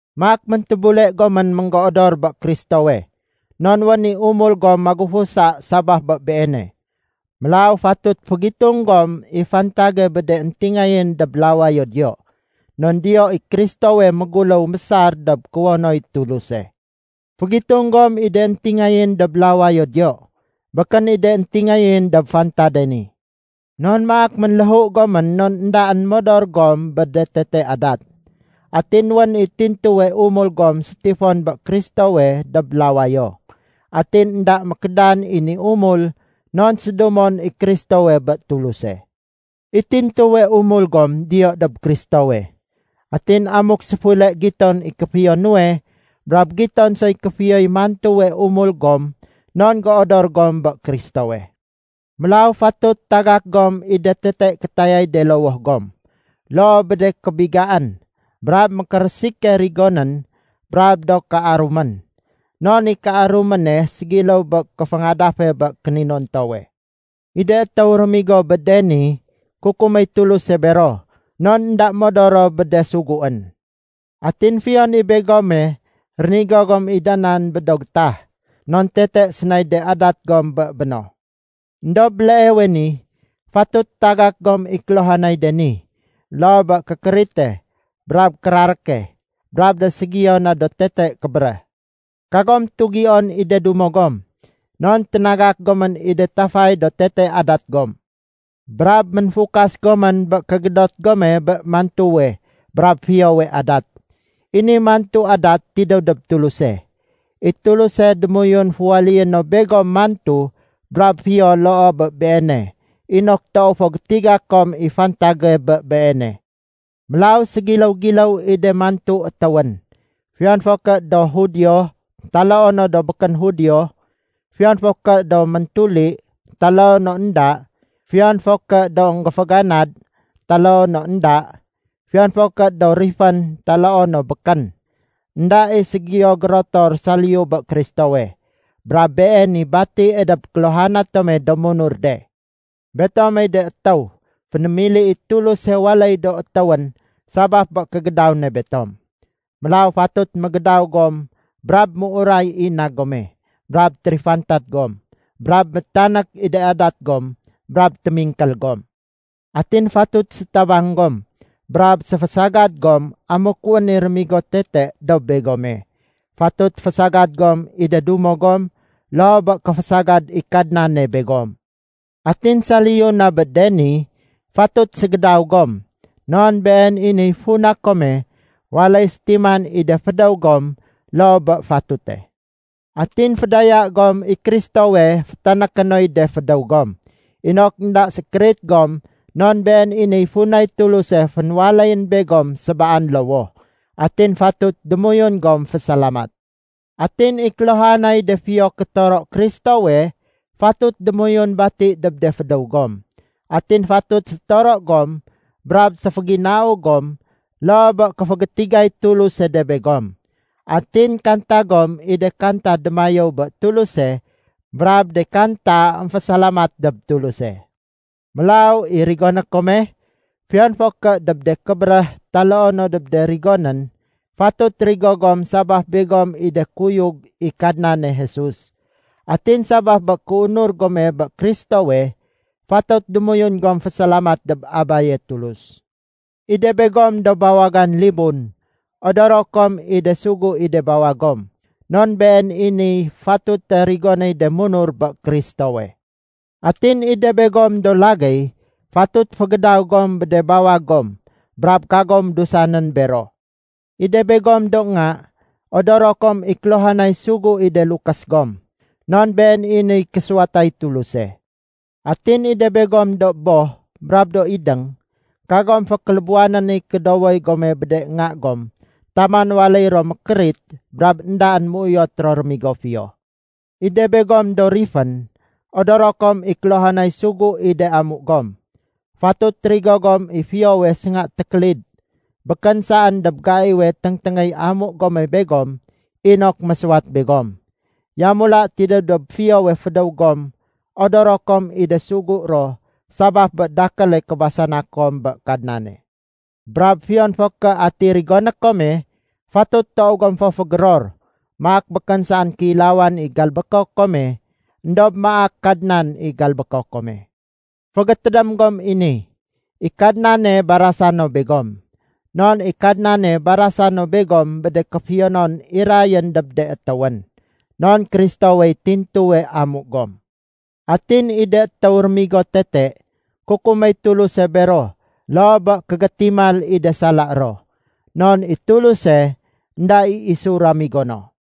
Maak méntébule gomén ménggéodor bé Kristowe, non wén i umul gom magufusa sabaf bé Beene. Mélaw fatut fégitung gom i fantage bé de éntingayén dob lawayo diyo. Non diyo i Kristowe méguléw mésar dob kuwonoy Tuluse. Fégitung gom i de éntingayén dob lawayo diyo, békén i de éntingayén dob fantade ni. Non maak ménléhu gomén non éndaén modor gom bé de tete adat. Atin wén i tintuwe umul gom sétifon bé Kristowe dob lawayo. Atin énda mékédan i ni umul non sédumon i Kristowe bé Tuluse. I tintuwe umul gom diyo dob Kristowe. Atin amuk séfule giton i kéfiyo nuwe, brab giton soy kéfiyoy mantuwe umul gom non géodor gom bé Kristowe. Mélaw fatut tagak gom i de tete kétayay de lowoh gom, loo bé de kébigaén, brab mékérésike rigonén brab do kéarumén. Non i kéaruméne ségiléw bé kéféngadafe bé kéninontowe. I de étéw rémigo bé de ni, kukuméy Tuluse bero non énda modor ro bé de suguén. Atin fiyon i begome, rénigo gom i da nan bé do gétah, non tete sénay de adat gom bé béno. Endob béleewe ni, fatut tagak gom i kéluhanay de ni, loo bé kékérite, brab kéraréke, brab de ségiyo na do tete kébéréh. Kagom tugion i de dumo gom, non ténagak gomén i de tafay do tete adat gom. Brab ménfukas gomén bé kégédot gome bé mantuwe brab fiyowe adat. I ni mantu adat tidéw dob Tuluse. I Tuluse démoyun féwaléyé no begom mantu brab fiyo loo bé Beene inok toow fo gétiga kom i fantage bé Beene. Mélaw ségiléw-giléw i de mantu étéwén, fiyon fo ké do Judio taloo no do békén Judio, fiyon fo ké do méntuli taloo no énda, fiyon fo ké do énggéféganad taloo no énda, fiyon fo ké do rifén taloo no békén. Enda i ségiyo gérotor saliyu bé Kristowe, brab Been i batie dob kéluhana tome do munur de. Betomey de étéw fénémili i Tuluse waléy do étéwén sabaf bé kégédaw ne betom. Mélaw fatut mégédaw gom brab méuray i na gome, brab térifantad gom, brab métanék i de adat gom brab témingkél gom. Atin fatut sétabang gom, brab séfésagad gom amuk wén i réménigo tete dob begome. Fatut fésagad gom i de dumo gom loo bé kéfésagad i Kadnane begom. Atin saliyu na bé de ni, fatut ségédaw gom, non been i niy funa kome waléy sétiman i de fédéw gom loo bé fatute. Atin fédaya gom i Kristowe fétanéké noy de fédéw gom, inok énda sékérit gom non been i niy funay Tuluse fénwaléyén begom sébaan lowoh. Atin fatut démoyun gom fésalamat. Atin i kéluhanay de fiyo kétoro Kristowe fatut démoyun bati dob de fédéw gom. Atin fatut sétoro gom brab séféginau gom loo bé kéfégétigay Tuluse de begom. Atin kanta gom i de kanta démayéw bé Tuluse brab de kanta émfésalamat dob Tuluse. Mélaw i rigoné kome, fiyon fo ké dob de kébéréh taloo no dob de rigonén, fatut rigo gom sabaf begom i de kuyug i Kadnane Jesus. Atin sabaf bé kéunur gome bé Kristowe, fatut démoyun gom fésalamat dob Abaye Tulus. I de begom do bawagan libun, odoro kom i de sugu i de bawag gom, non been i niy fatute rigonéy de munur bé Kristowe. Atin i de begom do lagéy, fatut fégédaw gom bé de bawag gom brab kagom dusanén bero. I de begom do nga, odoro kom i kéluhanay sugu i de lukés gom, non been i niy késuwatay Tuluse. Atin i de begom do boh brab do idéng, kagom fékélébuwanén i kédowoy gome bé de nga gom taman waléy ro mékérit brab éndaén méuyot ro rémigo fiyo. I de begom do rifén, odoro kom i kéluhanay sugu i de amu gom. Fatut rigo gom i fiyowe sénga tékélid, békén saén dob gaiwe téngténgéy amu gome begom inok mésuwat begom. Yamula tidéw dob fiyowe fédéw gom odoro kom i de sugu ro sabaf bé dakéle kébasana kom bé Kadnane. Brab fiyon fo ké ati rigoné kome, fatut toow gom fo fégéror, maak békén saén kéilawan i galbéko kome éndob maak Kadnan i galbéko kome. Fégétédém gom i ni, i Kadnane barasa no begom. Non i Kadnane barasa no begom bé de kéfiyonon irayén dob de étéwén. Non Kristowey tintuwe amu gom. Atin i de étéw rémigo tete, kukuméy Tuluse bero loo bé kégétimal i de sala ro. Non i Tuluse, énda i isu ramigo no.